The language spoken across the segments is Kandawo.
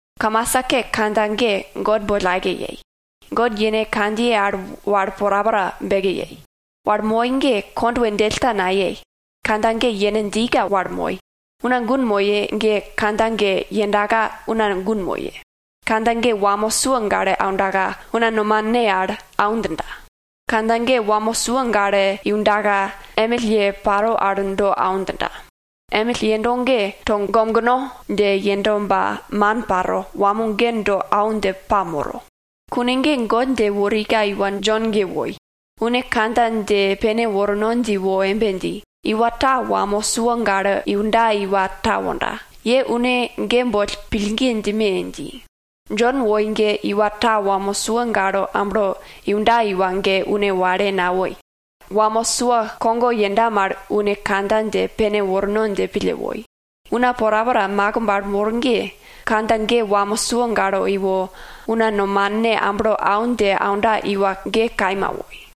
Kamasa ke kandja ge God boll aike yei. God yene kandjiye al wal porapora beke yei. Wal moi ge kondwe djell ta nayei, kandja ge yene djika wal moi. Una gun moye ge kandja ge yendaka una gun moye. Kandja ge wamo sua gale aundaka, una nomane al au djinda. Kandja ge wamo sua gale iundaka, emill ye paro al do au djinda. Emill yendo ge togomgno dje yendo ba man paro, wamo ge do au dje pamoro. Kune ge God dje worika iwa Jon ge woi. Une kandja dje pene worno dje wo embe dji, iwa ta wamo sua gale iunda iwa ta wonda, ye une ge boll pillgi djime! dji. Jon woi ge iwa ta wamo sua gale amblo iunda iwa ge une wale nawoi. Wamo sua kogo yenda mal une kandja dje pene worno dje pille woi. Una porapora makimb al mor ge, kandja ge wamo sua gale iwo, una nomane amblo au dje aunda iwa ge kaima woi.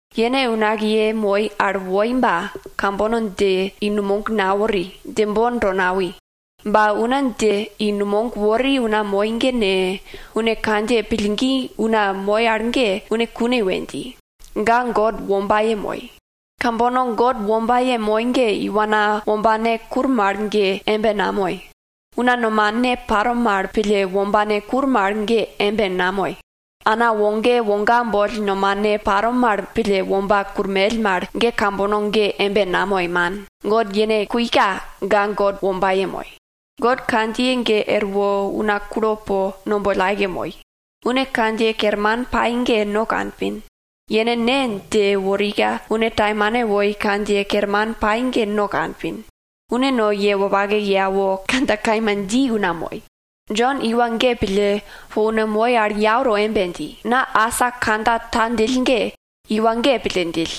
Yene unakiye moi al woi ba, kambono dje i numog nawori, djembon to nawi. Ba una dje i numog wori una moi ge ne, une kandjiye pillgi dji una moi al ge, une kune we dji, ga God wombaye moi. Kambono God wombaye moi ge iwana wombane kur mal ge embe namoi. Una nomane paro mal pille wombane kur mal ge embe namoi. Ana woge woga boll nomane paro mal pille womba kurmell mal ge kambono ge embe namoi, man. God yene kuika ga God wombaye moi. God kandjiye ge erwo una kulo po no boll aike moi. Une kandjiye kerman pai ge no kanpin, yene Ne dje worika, une taimane woi kandjiye kerman pai ge no kanpin. Une no ye wopake ye awo, kandja kaima dji una moi. Jon iwa ge pille, po una moi al yau to embe dji, na asa kandja ta djill ge, iwa ge pille djill.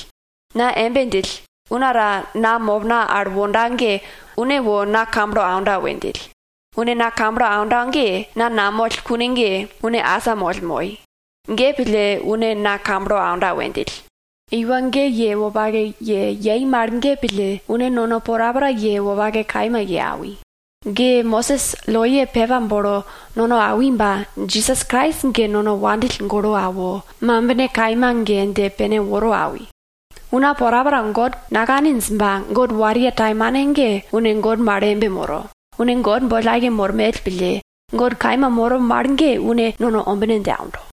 Na embe djill, una ta na mopna al wonda ge une wo na kamblo aunda we djill. Une na kamblo aunda ge, na namoll kune ge, une asamoll moi. Ge pille une na kamblo aunda we djill. Iwa ge ye wopake ye yei mal ge pille, une nono porapora ye wopake kaima ye awi. Ge Mosis loye pepa bolo nono awi ba, Jisas Krais ge nono wopake pille awo, mambine kaima ge dje pene woro awi. Una porapora God nakaninj ba, God wariye taimane ge une God mal embe moro, une God boll aike mormell pille, God kaima moro mal ge une nono ombine dje aundo.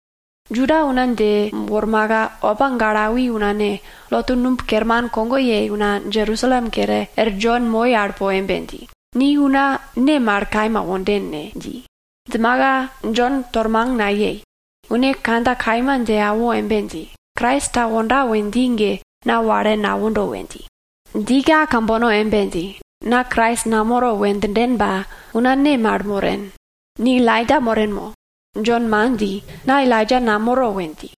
Juda una dje wormaka, opa gale awi una ne, lotu numb kerman kogo yei una Jerusalem kere, er Jon moi al po embe dji, ni una ne mal kaima wonden ne? dji. Djimaka Jon tormang nayei. Une kandja kaima dje awo embe dji, Krais ta wonda we dji ge na wale nawondo we dji. Djika kambono embe dji, na Krais namoro we djinden ba, una ne mal moren? Ni Elaija moren mo? Jon man dji, na Elaija namoro we dji.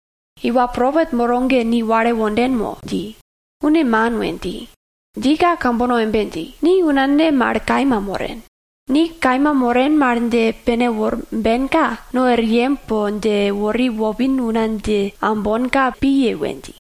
Iwa propet moro ge ni wale wonden mo? dji. Une man, we dji. Djika kambono embe dji, ni una ne mal kaima moren? Ni kaima moren mal dje pene worbenka, no er yem po dje wori wopin una dje aumbonka piye we dji.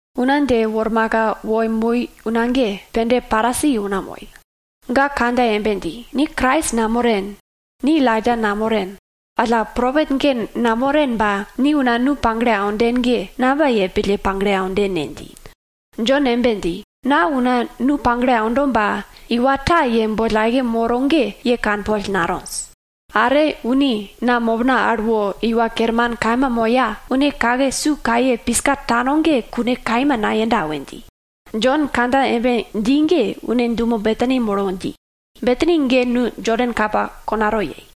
Una dje wormaka wo moi una ge, pende Parisi una moi. Ga kandja embe dji, ni Krais namoren, ni Elaija namoren, alla propet ge namoren ba, ni una nu pagle aunden ge, namba yei pille pagle aunden ne? dji. Jon embe dji, na una nu pagle aundo ba, iwa ta ye boll aike moro ge ye kanpol natonj. Are une na mopna al wo Iwa Kerman kaima moya, une kake su kaye piska tano ge kune kaima nayenda we dji. Jon kandja embe dji ge une dumo Betani molo dji. Betani ge nu Jodan kapa konato yei.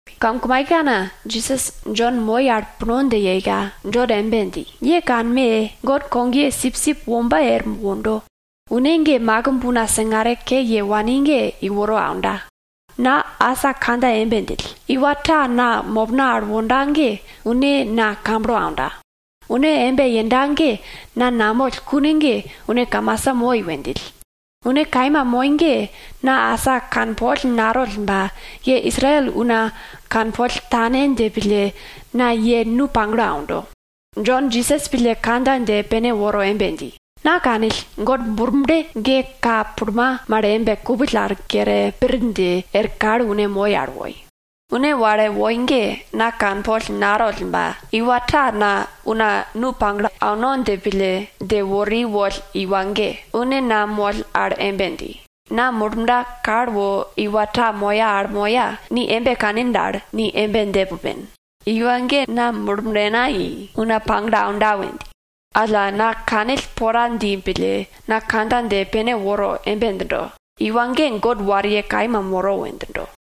Kamkumaikekana Jisas Jon moi al puno dje yeika, Jon embe dji, ye kanme! God kogye sipsip wombe er wondo. Une ge makimb una singare ke ye wani ge iworo aunda. Na asa kandja embe djill, iwa ta na mopna al wonda ge une na kamblo aunda. Une embe yenda ge na namoll kune ge une kamasa moi we djill. Une kaima moi ge na asa kanpol natoll ba, ye Israel una kanpol tane dje pille, na ye nu pagle aundo. Jon Jisas pille kandja dje pene woro embe dji, na kanill, God Murble ge ka pulma mal embe kupill al kere pir dje er kal une moi al woi. Une wale woi ge, na kanpol natoll ba, iwa ta na una nu pagle auno dje pille dje wori woll iwa ge, une na moll al embe dji, na Murblena kal wo iwa ta moya al moya, ni embe kanin dal, ni embe dje pupen, iwa ge na Murblena i, una pagle aunda we dji. Alla, na kanill pora dji pille, na kandja dje pene woro embe djindo, iwa ge God wariye kaima moro we djindo.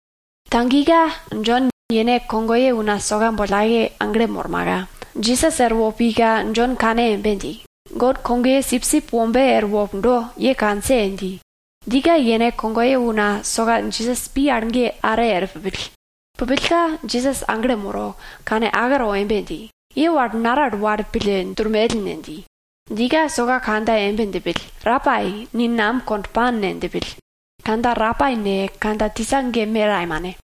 Tagika Jon yene kogoye una soka boll aike aglo molmaka Jisas erwo pika, Jon kane embe dji, God kogye sipsip wombe erwo pundo, ye kanse! dji. Djika yene kogoye una soka Jisas pi al ge are er pupill. Pupillka Jisas aglo molo, kane ake to embe dji, ye wal naral wal pille durmell ne? dji. Djika soka kandja embe djipill, Rapai, ni nam kond pan ne? djipill (kandja Rapai ne, kandja tisa ge me taimane)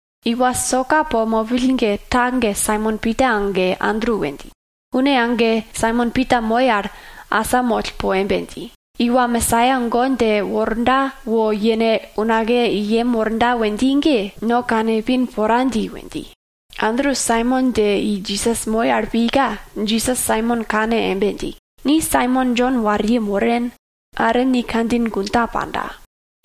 Iwa soka po mopill ge ta ge Saimon Pita age Andru we dji. Une age Saimon Pita moi al asamoll po embe dji, iwa Mesaia God dje worda wo yene unakiye i yem worda we dji ge, no kane ipin pora dji we dji. Andru Saimon dje i Jisas moi al pika, Jisas Saimon kane embe dji, ni Saimon Jon wariye moren, are ni kandjin gun ta panda,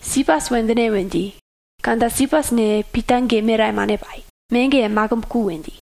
Sipas we djine we dji (kandja Sipas ne, Pita ge me taimane pai, me ge makimb ku we dji)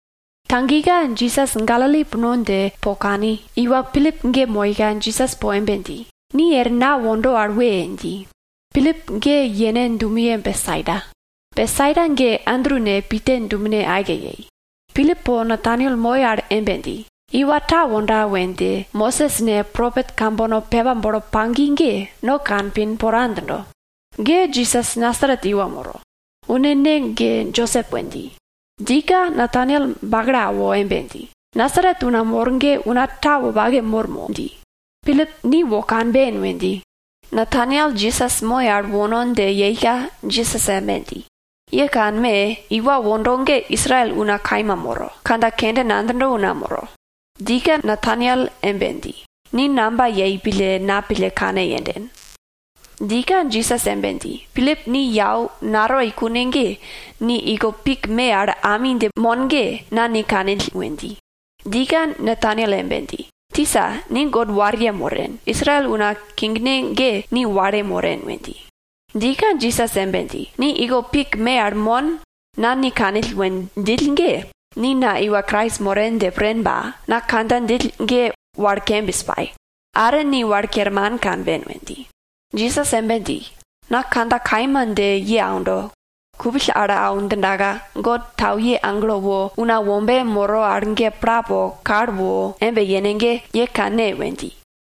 Tagika Jisas Galili puno dje po kani, iwa Pilip ge moika Jisas po embe dji, ni er na wondo al we! dji. Pilip ge yene dumeye Betsaida. Betsaida ge Andru ne Pita dumene aike yei. Pilip po Nataniel moi al embe dji, iwa ta wonda we dje Mosis ne, propet kambono pepa bolo pagi ge, no kanpin pora djindo. Ge Jisas Nasaret iwa moro, une ne ge Josep we dji. Djika Nataniel bakalo awo embe dji, Nasaret una mor ge una ta wopake mor mo? dji. Pilip, ni wo kanben we dji. Nataniel Jisas moi al wono dje yeika, Jisas embe dji, ye kanme! Iwa wondo ge Israel una kaima moro, kandja kende nadjindo una moro. Djika Nataniel embe dji, ni namba yei pille na pille kane yenden? Djika Jisas embe dji, Pilip ni yau natoi kune ge, ni iko pik me al ami dje mon ge, na ni kanill we dji. Djika Nataniel embe dji, Tisa, ni God wariye moren. Israel una kingne ge ni wale moren we dji. Djika Jisas embe dji, ni iko pik me al mon, na ni kanill we djill ge, ni na iwa Krais moren dje pren ba, na kandja djill ge wal kembis pai, are ni wal kerman kanben we dji. Jisas embe dji, na kandja kaima dje ye aundo, kupill al au djindaka God tauye agelo wo Una Wombe moro al ge pla po kal wo embe yene ge, ye kanne we dji.